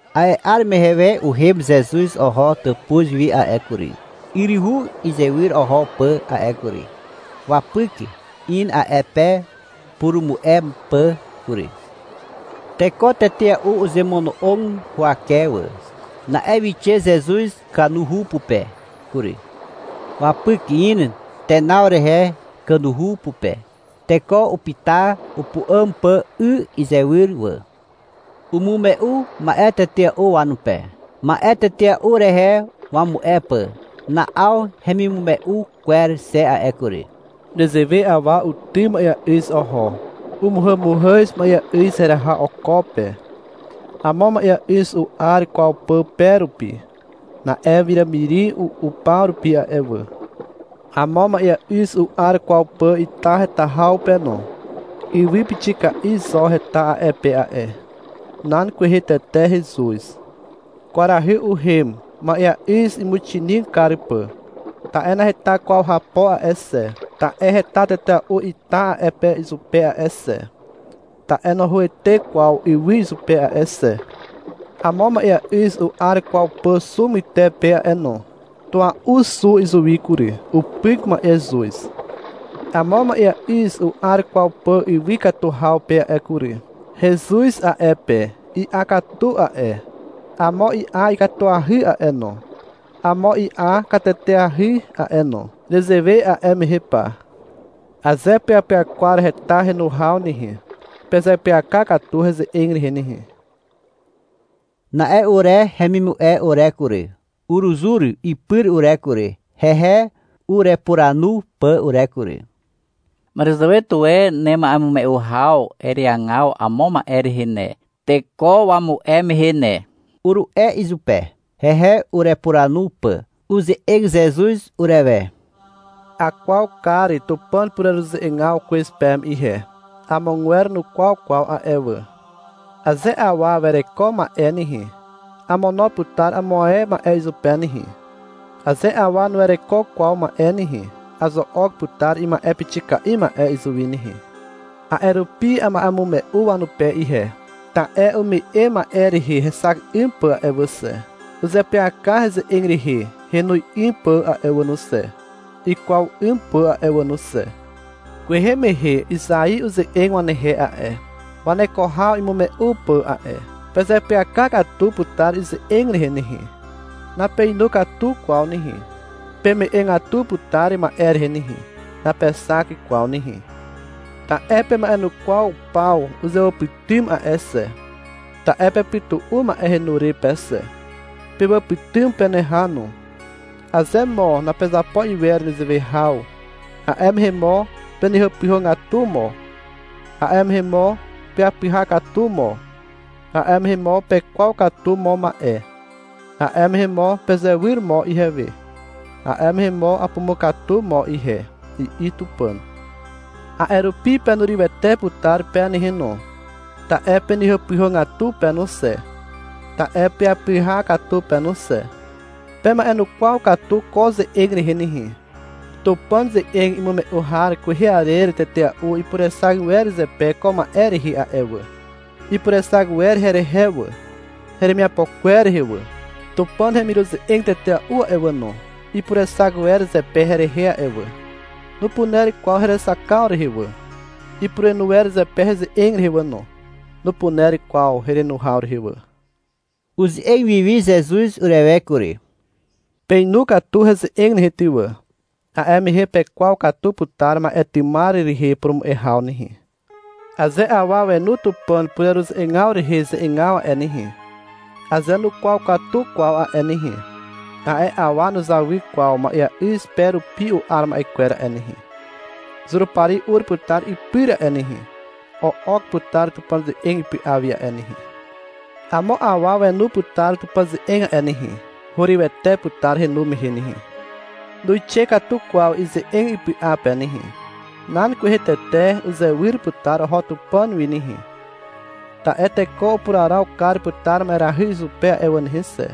A'e 'ar mehe we uhem Zezuz oho tàpuz wi a'e kury, yryhu izywyr oho pà a'e kury. Wapyk in a'e pe purumu'e pà kury. Teko tetea'u uzemono'og huwake wà. Na'e wixe Zezuz kanuhu pupe kury. Wapyk in tenaw rehe kanuhu pupe. Teko upyta upu'àm pà 'y izywyr wà. Umume'u ma'e tetea'u wanupe, ma'e tetea'u rehe wamu'e pà. Na'aw hemimume'u kwer xe a'e kury. — Nezewe awa utym ma'eà'yz oho. Umuhàmuhàz ma'eà'yz heraha oko pe. Amo ma'eà'yz u'ar kwaw pà pe rupi. Na'e wiràmiri u'u paw rupi a'e wà. Amo ma'eà'yz u'ar kwaw pà ita heta haw pe no. Ywy pixika'i zo heta a'e pe a'e. Nan kwehe tete hezuz. Kwarahy uhem, ma'eà'yz imuxinig kar pà. Ta'e naheta kwaw hapo a'e xe. Ta'e heta tetea'u ita a'e pe izupe a'e xe. Ta'e nohoete kwaw ywy izupe a'e xe. Amo ma'eà'yz u'ar kwaw pà xu pytepe a'e no. Tua'u xu izuwi kury. Upyk ma'ezuz. Amo ma'eà'yz u'ar kwaw pà ywy katu haw pe a'e kury. Hezuz a'e pe. I'a katu a'e, amo i'a katuahy a'e no, amo i'a kateteahy a'e no. Nezewe a'e mehe pa. Aze peapyakwar heta henu haw nehe, pezeapyaka katu heze'eg rehe nehe. Na'e ure hemimu'e ure kury, uruzur ipyr ure kury, hehe urepuranu pà ure kury. — Màràzàwe tuwe nema'emume'u haw ereagaw amo ma'e rehe ne, teko wamu'e mehe ne, uru'e izupe, hehe urepuranu pà. Uze'eg Zezuz urewe. — Akwaw kar Tupàn pureruze'egaw kwez peme ihe. Amogwer nukwaw kwaw a'e wà. Aze awa wereko ma'e nehe, amono putar amo ae ma'e izupe nehe. Aze awa nuwereko kwaw ma'e nehe, azo'ok putar ima'e pixika'i ma'e izuwi nehe. A'e rupi ama'emume'u wanupe ihe. Ta'e ume'e ma'e rehe hexak 'ym pà a'e wà xe. Uzeapyaka heze'eg rehe henu 'ym pà a'e wà no xe, ikwaw 'ym pà a'e wà no xe. Kwehe mehe Izai uze'eg wanehe a'e, waneko haw imume'u pà a'e. Pezeapyaka katu putar ize'eg rehe nehe. Napeinu katu kwaw nehe. Peme'egatu putar ma'e rehe nehe. Napexak kwaw nehe. Ta'e pema'enukwaw paw uzewàpytym a'e xe. Ta'e pepytu'u ma'e henu re pe xe. Pewàpytym peneha no. Aze mo napezapo iwer nezewe haw, A'e mehe mo penehàpyhàgatu mo, A'e mehe mo peapyha katu mo, A'e mehe mo pekwaw katu mo ma'e, A'e mehe mo pezewyr mo ihewe, A'e mehe mo apumukatu mo ihe, I'i Tupàn. A'e rupi penurywete putar pe nehe no, ta'e penehàpyhàgatu pe no xe, ta'e peapyha katu pe no xe. Pema'enukwaw katu ko ze'eg rehe nehe. Tupàn ze'eg imume'u har kwehe arer tetea'u ipurexak wer zepe ko ma'e rehe a'e wà. Ipurexak wer herehe wà, heremiapo kwer rehe wà. Tupàn hemiruze'eg tetea'u a'e wà no, ipurexak wer zepe herehe a'e wà. Nupuner kwaw herexakaw rehe wà. Ipurenu wer zepe heze'eg rehe wà no. Nupuner kwaw herenu haw rehe wà. (Uze'eg wiwi Zezuz urewe kury.) — Peinu katu heze'eg nehe ty wà. A'e mehe pekwaw katu putar ma'e tymar rehe purumu'e haw nehe. Aze awa wenu Tupàn pureruze'egaw rehe ze'egaw a'e nehe, aze nukwaw katu kwaw a'e nehe, a'e awa nuzawy kwaw ma'eà'yz pe rupi u'ar ma'e kwer a'e nehe. Zurupari ur putar ipyr a'e nehe, o'ok putar Tupàn ze'eg ipy'a wi a'e nehe. Amo awa wenu putar Tupàn ze'eg a'e nehe, hurywete putar henu mehe nehe. Nuixe katu kwaw ize'eg ipy'a pe nehe. Nan kwehe tete uzewyr putar oho Tupàn wi nehe, ta'e teko upuraraw kar putar ma'erahy izupe a'e wà nehe xe,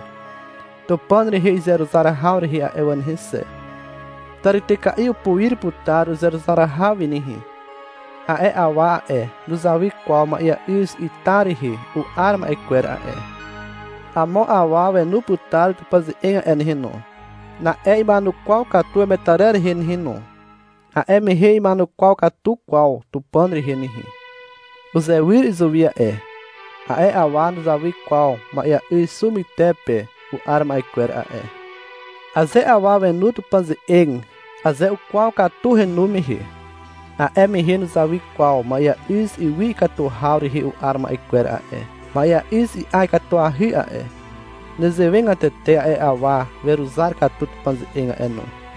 Tupàn rehe izeruzar haw rehe a'e wà nehe xe. Tàrityka'i upuir putar uzeruzar haw wi nehe. A'e awa a'e, nuzawy kwaw ma'eà'yz ita rehe u'ar ma'e kwer a'e. Amo awa wenu putar Tupàn ze'eg a'e nehe no. Na'e ima'enukwaw katu wemetarer rehe nehe no. A'e mehe na'ima'enukwaw katu kwaw Tupàn rehe nehe. Uzewyr izuwi a'e. A'e awa nuzawy kwaw ma'eà'yz xu pyter pe u'ar ma'e kwer a'e. Aze awa wenu Tupàn ze'eg, aze ukwaw katu henu mehe, a'e mehe nuzawy kwaw ma'eà'yz ywy ikatu haw rehe u'ar ma'e kwer a'e. Ma'eà'yz i'a katuahy a'e. Nezewegatete a'e awa weruzar katu Tupàn ze'eg a'e no.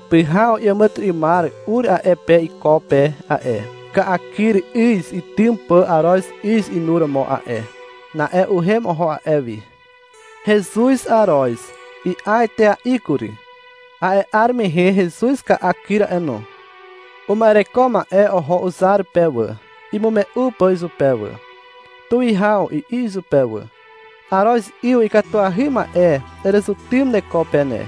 Pyhaw iàmàtyry'ymar ur a'e pe iko pe a'e, ka'akyr 'yz itym pà aroz 'yz inuromo a'e. Na'e uhem oho a'e wi. Hezuz aroz. I'a etea'i kury. A'e 'ar mehe hezuz ka'a kyr a'e no. Uma'ereko ma'e oho uzar pe wà, imume'u pà izupe wà. — Tuwihaw, i'i izupe wà. — Aroz 'yz ikatuahy ma'e erezutym neko pe ne.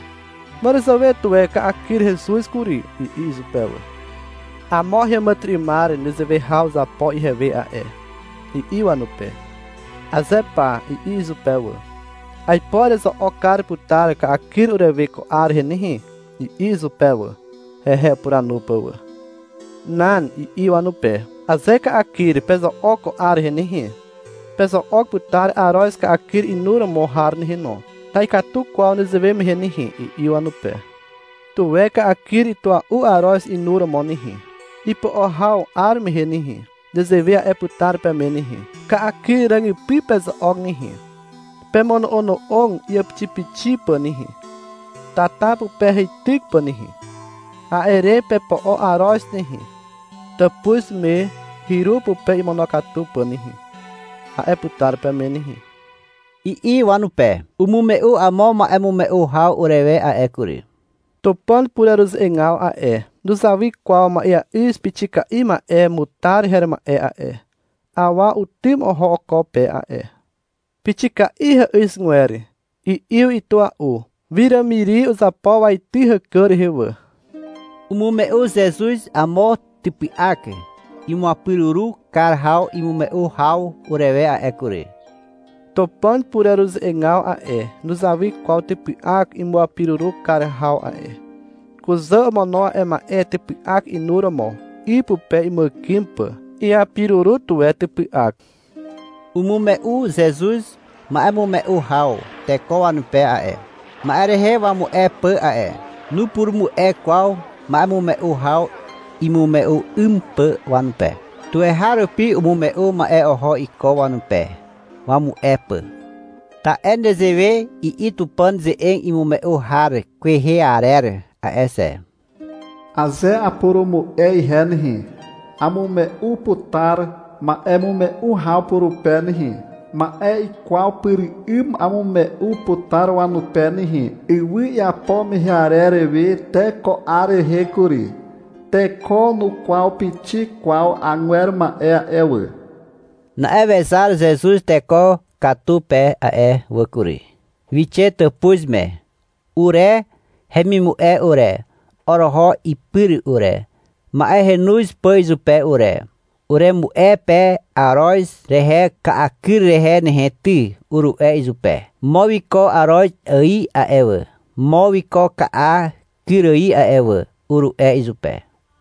Màràzàwe tuwe ka'akyr hezuz kury, i'i izupe wà. — Amo heàmàtyry'ymar nezewe haw uzapo ihewe a'e, i'i wanupe. — Aze pa, i'i izupe wà. — Aipo erezo'ok kar putar ka'akyr urewe ko 'ar rehe nehe, i'i izupe wà, hehe upuranu pà wà. — Nan, i'i wanupe. — Aze ka'akyr pezo'ok ko 'ar rehe nehe, pezo'ok putar aroz ka'akyr inuromo har nehe no. Na'ikatu kwaw nezewe mehe nehe, i'i wanupe. — Tuwe ka'akyr itua'u aroz inuromo nehe. — Ipo'o haw 'ar mehe nehe, nezewe a'e putar peme nehe. — Ka'akyr ràgypy pezo'ok nehe. Pemono'ono'og iàpixipixi pà nehe, tata pupe heityk pà nehe. A'e re pepo'o aroz nehe, tàpuz me hyru pupe imonokatu pà nehe, a'e putar peme nehe, i'i wanupe. Umume'u amo ma'emume'u haw urewe a'e kury. — Tupàn pureruze'egaw a'e, nuzawy kwaw ma'eà'yz pixika'i ma'e mutar her ma'e a'e. Awa utym oho oko pe a'e. Pixika'i hà'yzgwer. I'yw itua'u. Wiràmiri uzapo waity hàkà rehe wà. Umume'u Zezuz amo typy'ak imuapiruru kar haw imume'u haw urewe a'e kury. Tupàn pureruze'egaw a'e, nuzawy kwaw typy'ak imuapiruru kar haw a'e. Kuzà omono a'e ma'e typy'ak inuromo, 'y pupe imuàkym pà. Iapiruru tuwe typy'ak. Umume'u Zezuz ma'emume'u haw teko wanupe a'e, ma'e rehe wamu'e pà a'e. Nupurumu'e kwaw ma'emume'u haw imume'u 'ym pà wanupe. Tuweharupi umume'u ma'e oho iko wanupe, wamu'e pà. Ta'e nezewe i'i Tupàn ze'eg imume'u har kwehe arer a'e xe. — Aze apurumu'e ihe nehe, amume'u putar ma'emume'u haw purupe nehe. Ma'e ikwaw pyr 'ym amume'u putar wanupe nehe. Ywy iapo mehe arer we te ko 'ar rehe kury, teko nukwaw pixik kwaw agwer ma'e a'e wà. Na'e wezar Zezuz teko katu pe a'e wà kury. Wixe tàpuz me. Ure hemimu'e ure, oroho ipyr ure, ma'e henoz pà izupe ure. — Uremu'e pe aroz rehe ka'akyr rehe nehe ty, uru'e izupe. — Mo wiko aroz ài a'e wà, mo wiko ka'a kyr ài a'e wà, uru'e izupe.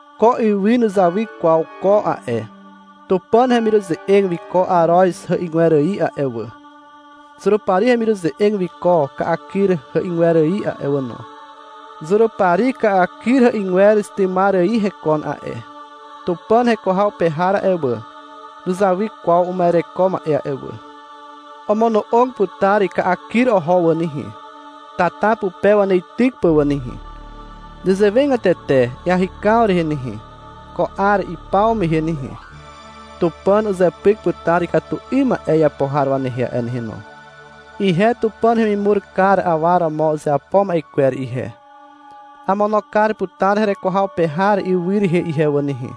Ko ywy nuzawy kwaw ko a'e. Tupàn hemiruze'eg wiko aroz hà'yzgwer ài a'e wà. Zurupari hemiruze'eg wiko ka'akyr hà'yzgwer ài a'e wà no. Zurupari ka'akyr hà'yzgwer tymar ài hekon a'e. Tupàn heko haw pe har a'e wà, nuzawy kwaw uma'ereko ma'e a'e wà. Omono'og putar ka'a kyr oho wà nehe, tata pupe waneityk pà wà nehe. Nezewegatete iahykaw rehe nehe, ko 'ar ipaw mehe nehe, Tupàn uzepyk putar ikatu 'ym ma'e iapo har wanehe a'e nehe no. Ihe Tupàn hemimur kar awa romo uzeapo ma'e kwer ihe, amono kar putar hereko haw pe har ywy rehe ihe wà nehe.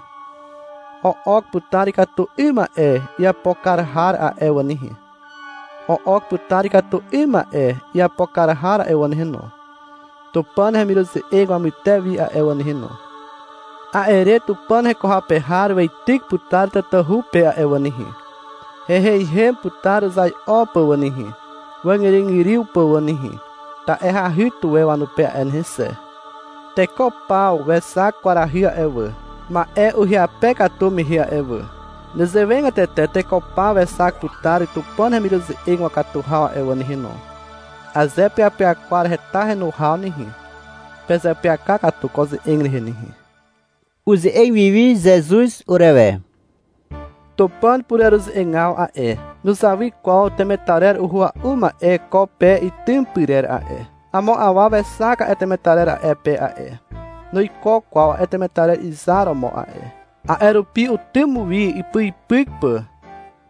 O'ok putar ikatu 'ym ma'e iapo kar har a'e wà nehe, o'ok putar ikatu 'ym ma'e iapo har a'e wà nehe no, Tupàn hemiruze'eg wamyter wi a'e wà nehe no. A'e re Tupàn heko haw pe har weityk putar tatahu pe a'e wà nehe. Heiheihem putar uzai'o pà wà nehe, wàzgyrygyryw pà wà nehe, ta'e hahy tuwe wanupe a'e nehe xe. Teko paw wexak kwarahy a'e wà, ma'e ihyape katu mehe a'e wà. Nezewegatete teko paw wexak putar Tupàn hemiruze'eg wakatu haw a'e wà nehe no. Aze peapyakwar heta henu haw nehe, pezeapyaka katu ko ze'eg rehe nehe. (Uze'eg wiwi Zezuz urewe.) — Tupàn pureruze'egaw a'e, nuzawy kwaw temetarer uhua'u ma'e ko pe itym pyrer a'e. Amo awa wexak a'e temetarer a'e pe a'e. Nuiko kwaw a'e temetarer izar romo a'e. A'e rupi utym wi ipyipyk pà.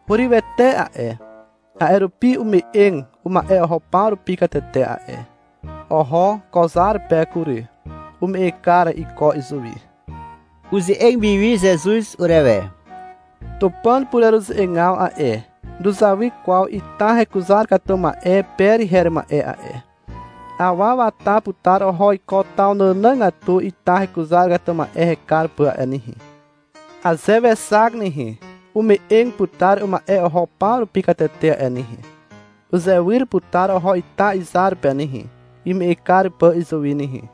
Hurywete a'e, a'e rupi ume'eg uma'e oho paw rupi katete a'e. Oho ko zar pe kury. Ume'eg kar iko izuwi. (Uze'eg wiwi Zezuz urewe.) — Tupàn pureruze'egaw a'e, nuzawy kwaw ita hekuzar katu ma'e per her ma'e a'e. Awa wata putar oho iko taw nànàgatu ita hekuzar katu ma'e hekar pà a'e nehe. Aze wexak nehe, ume'eg putar uma'e oho paw rupi katete a'e nehe. Uzewyr putar oho ita izar pe nehe, ime'eg kar pà izuwi nehe.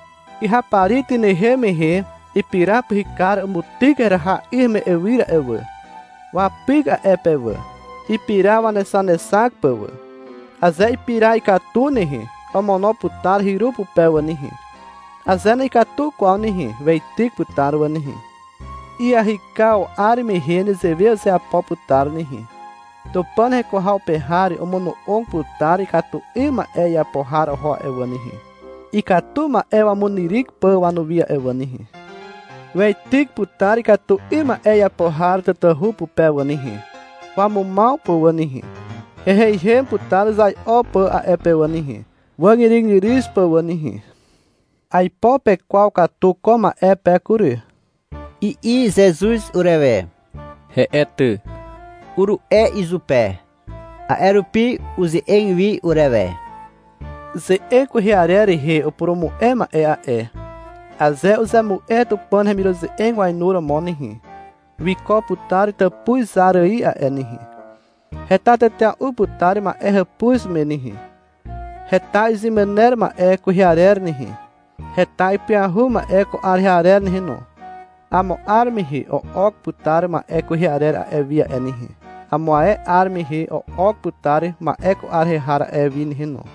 Kyhapari tynehem mehe ipira pyhykar umutyk heraha 'y heme'ywyr a'e wà. Wapyk a'e pe wà, ipira wanexanexak pà wà. Aze ipira ikatu nehe, omono putar hyru pupe wà nehe. Aze na'ikatu kwaw nehe, weityk putar wà nehe. Iahykaw 'ar mehe nezewe uzeapo putar nehe. Tupàn heko haw pe har omono'og putar ikatu 'ym ma'e iapo har oho a'e wà nehe, ikatu ma'e wamunyryk pà wanuwi a'e wà nehe. Weityk putar ikatu 'ym ma'e iapo har tatahu pupe wà nehe, wamumaw pà wà nehe. Heiheihem putar uzai'o pà a'e pe wà nehe, wàzgyrygyryw pà wà nehe. — Aipo pekwaw katu ko ma'e pe kury, i'i Zezuz urewe. — He'e ty, uru'e izupe. A'e rupi uze'eg wi urewe. — Ze'eg kwehe arer rehe upurumu'e ma'e a'e, aze uzemu'e Tupàn hemiruze'eg wainuromo nehe, wiko putar tàpuz zar ài a'e nehe. Heta tetea'u putar ma'e hàpuz me nehe. Heta izemàner ma'e kwehe arer nehe, heta ipyahu ma'e ko 'ar rehe har nehe no. Amo 'ar mehe o'ok putar ma'e kwehe arer a'e wi a'e nehe. Amo ae 'ar mehe o'ok putar ma'e ko 'ar rehe har a'e wi nehe no.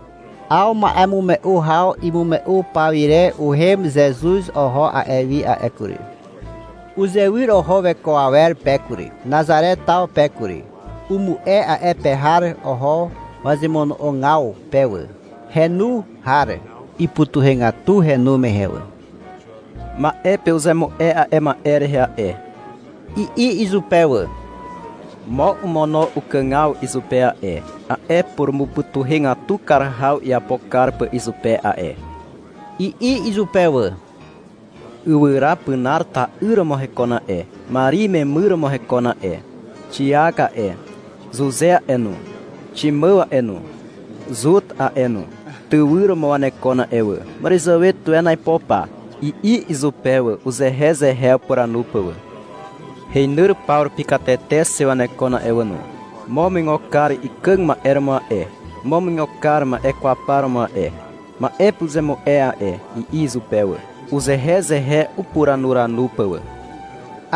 'Aw ma'emume'u haw imume'u paw ire uhem Zezuz oho a'e wi a'e kury. Uzewyr oho weko awer pe kury, Nazare taw pe kury. Umu'e a'e pe har oho wazemono'ogaw pe wà. Henu har ipytuhegatu henu mehe wà. — Ma'e pe uzemu'e a'e ma'e rehe a'e, i'i izupe wà. — Mo omono ukàgaw izupe a'e, a'e purumupytuhegatu kar haw iapo kar pà izupe a'e, i'i izupe wà. — Ywyra pinar ta'yr romo hekon a'e. Mari imemyr romo hekon a'e. Xiak a'e, Zuze a'e no, Ximàw a'e no, Zut a'e no, tywyr romo wanekon a'e wà. Màràzàwe tuwe aipo pa, i'i izupe wà, uzehezehe upuranu pà wà. — Heinyr paw rupi katete xe wanekon a'e wà no. Mo umuigo kar ikàg ma'e romo a'e. Mo umuigo kar ma'e kwaw par romo a'e, ma'e pe uzemu'e a'e, i'i izupe wà, uzehezehe upuranuranu pà wà.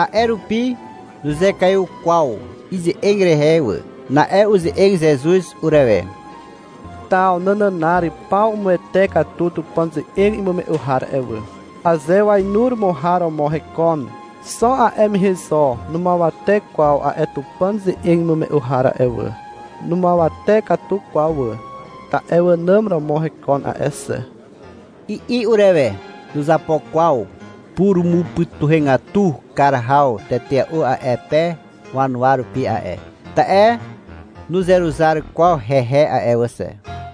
A'e rupi nuzekaiw kwaw ize'eg rehe wà. Na'e uze'eg Zezuz urewe. — Taw nànànar paw umuwete katu Tupàn ze'eg imume'u har a'e wà. Aze wainuromo har romo hekon, xo a'e mehe zo numuawate kwaw a'e Tupàn ze'eg imume'u har a'e wà. Numuawate katu kwaw wà, ta'e wànàm romo hekon a'e xe, i'i urewe. Nuzapo kwaw purumupytuhegatu kar haw tetea'u a'e pe wanuwa rupi a'e, ta'e nuzeruzar kwaw hehe a'e wà xe.